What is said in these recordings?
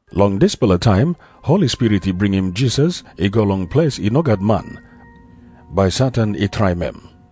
Long dispela taim Holi Spirit i bringim Jisas i go long ples i no gat man, bai Satan i traim em.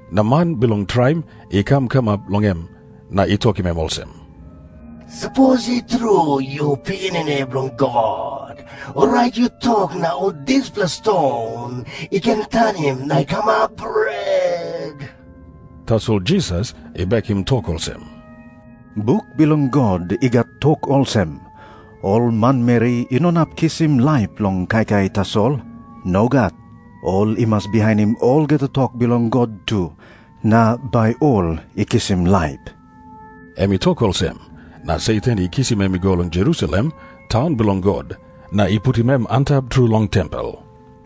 Na man bilong traim i kam kamap long em, na i tokim em olsem, “Sapos i tru yu Pikinini Bilong God, orait yu tok na ol dispela ston i ken tanim na i kamap bret.” Tasol Jisas i bekim tok olsem, “Buk bilong God i gat tok olsem, ‘Ol manmeri i no inap kisim laip long kaikai tasol. Nogat. Ol i mas bihainim olgeta tok bilong God tu na bai ol i kisim laip.’” Em i tok olsem, na Satan i kisim em i go long Jerusalem, taun bilong God, na i putim em antap tru long tempel.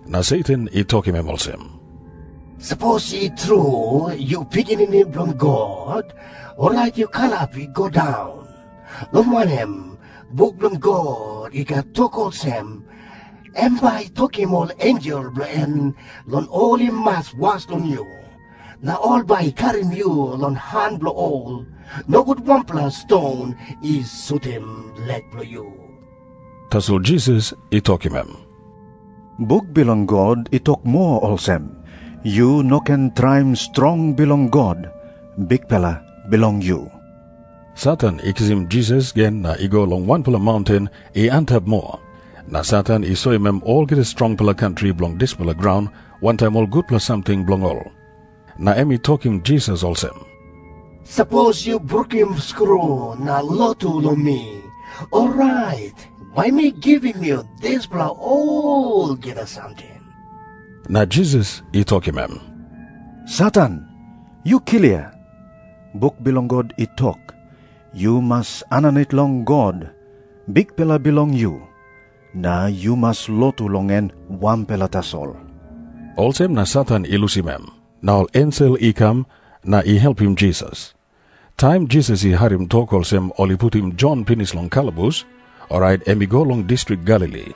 Na Satan i tokim em olsem, “Sapos i tru yu Pikinini Bilong God, orait yu kalap i go daun. Long wanem, buk bilong God i gat tok olsem, ‘Em bai i tokim ol ensel bilong en long ol i mas was long yu.’ Na ‘Ol bai i karim yu long han bilong ol, nogut wanpela ston i sutim lek bilong yu.’” Tasol Jisas i tokim em, “Buk bilong God i tok moa olsem, ‘Yu no ken traim strong bilong God, Bikpela bilong yu.’” Satan i kisim Jisas gen na i go long wanpela maunten i antap moa. Na Satan i soim em olgeta strongpela kantri bilong dispela graun wantaim ol gutpela samting bilong ol. Na em i tokim Jisas olsem, “Sapos yu brukim skru na lotu long mi, orait bai mi givim yu dispela olgeta samting.” Na Jisas i tokim em, “Satan, yu klia. Buk bilong God i tok, ‘Yu mas aninit long God, Bikpela bilong yu. Na yu mas lotu long em wanpela tasol.’” Olsem na Satan i lusim em. Na ol ensel i kam na i helpim Jisas. Taim Jisas i harim tok olsem, ol i putim Jon pinis long kalabus, orait em i go long distrik Galili.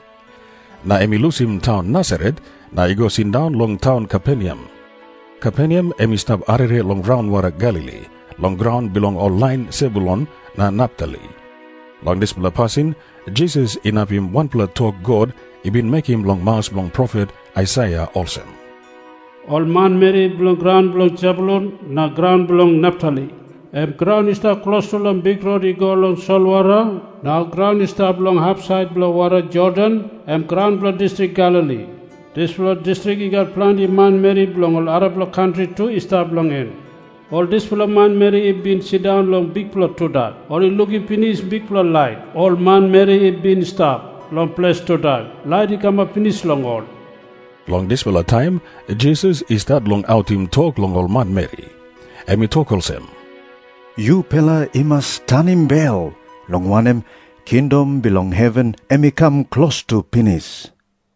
Na em i lusim taun Nasaret na i go sindaun long taun Kaperneam. Kaperneam em i stap arere long raunwara Galili, long graun bilong ol lain Sebulun na Naptali. Long dispela pasin Jisas inapim wanpela tok God i bin mekim long maus bilong profet Aisaia olsem, “Ol manmeri bilong graun bilong Sebulun na graun bilong Naptali, em graun i stap klostu long bikrot i go long solwara na graun i stap long hapsait bilong wara Jordan, em graun bilong distrik Galili, dispela distrik i gat planti manmeri bilong ol arapela kantri tu i stap long en, ol dispela manmeri i bin sindaun long bikpela tudak, ol i lukim pinis bikpela lait. Ol manmeri i bin stap long ples tudak, lait i kamap pinis long ol.” Long dispela taim Jisas i stat long autim tok long ol manmeri. Em i tok olsem, “Yupela i mas tanim bel, long wanem, kingdom bilong heven em i kam klostu pinis.”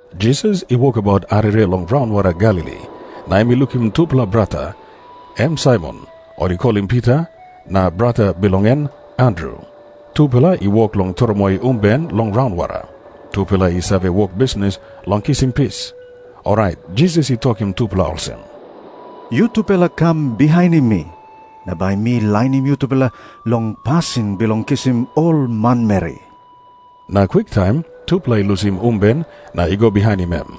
Jisas i wokabaut arere long raunwara Galili, na em i lukim tupela brata, em Saimon, ol i kolim Pita, na brata bilong en Andru. Tupela i wok long tromoi umben long raunwara. Tupela i save wok bisnis long kisim pis. Orait Jisas i tokim tupela olsem, “Yutupela kam bihainim mi, na bai mi lainim yutupela long pasin bilong kisim ol manmeri.” Na kwiktaim tupela i lusim umben na i go bihainim em.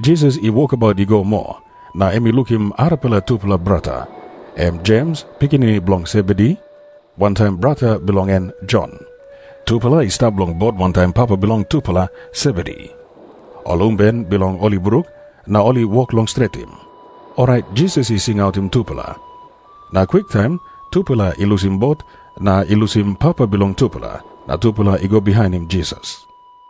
Jisas i wokabaut i go moa, na em i lukim arapela tupela brata, em Jems, pikinini bilong Sebedi, wantaim brata bilong en Jon. Tupela i stap long bot wantaim papa bilong tupela, Sebedi. Ol umben bilong ol i bruk, na ol i wok long stretim. Orait Jisas i singautim tupela. Na kwiktaim tupela i lusim bot na i lusim papa bilong tupela, na tupela i go bihainim Jisas.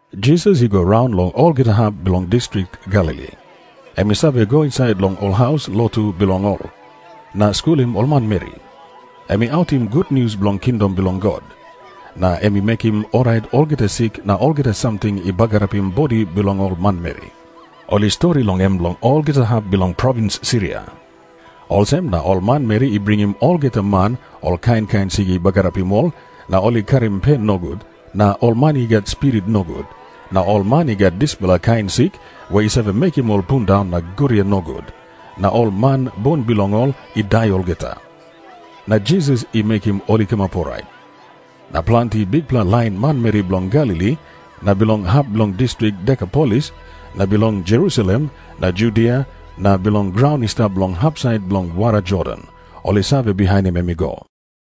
Jisas i go raun long olgeta hap bilong distrik Galili. Em i save go insait long ol haus lotu bilong ol na skulim ol manmeri. Em i autim gutnius bilong kingdom bilong God, na em i mekim orait olgeta sik na olgeta samting i bagarapim bodi bilong ol manmeri. Ol i stori long em long olgeta hap bilong provins Siria. Olsem na ol manmeri i bringim olgeta man ol kain kain sik i bagarapim ol na ol i karim pen nogut, na ol man i gat spirit nogut, na ol man i gat dispela kain sik i save mekim ol i pundaun na guria nogut, na ol man bun bilong ol i dai olgeta. Na Jisas i mekim ol i kamap orait. Na planti bikpela lain manmeri bilong Galili na bilong hap bilong distrik Dekapolis, na bilong Jerusalem na Judia na bilong graun i stap long hapsait bilong wara Jordan, ol i save bihainim em i go.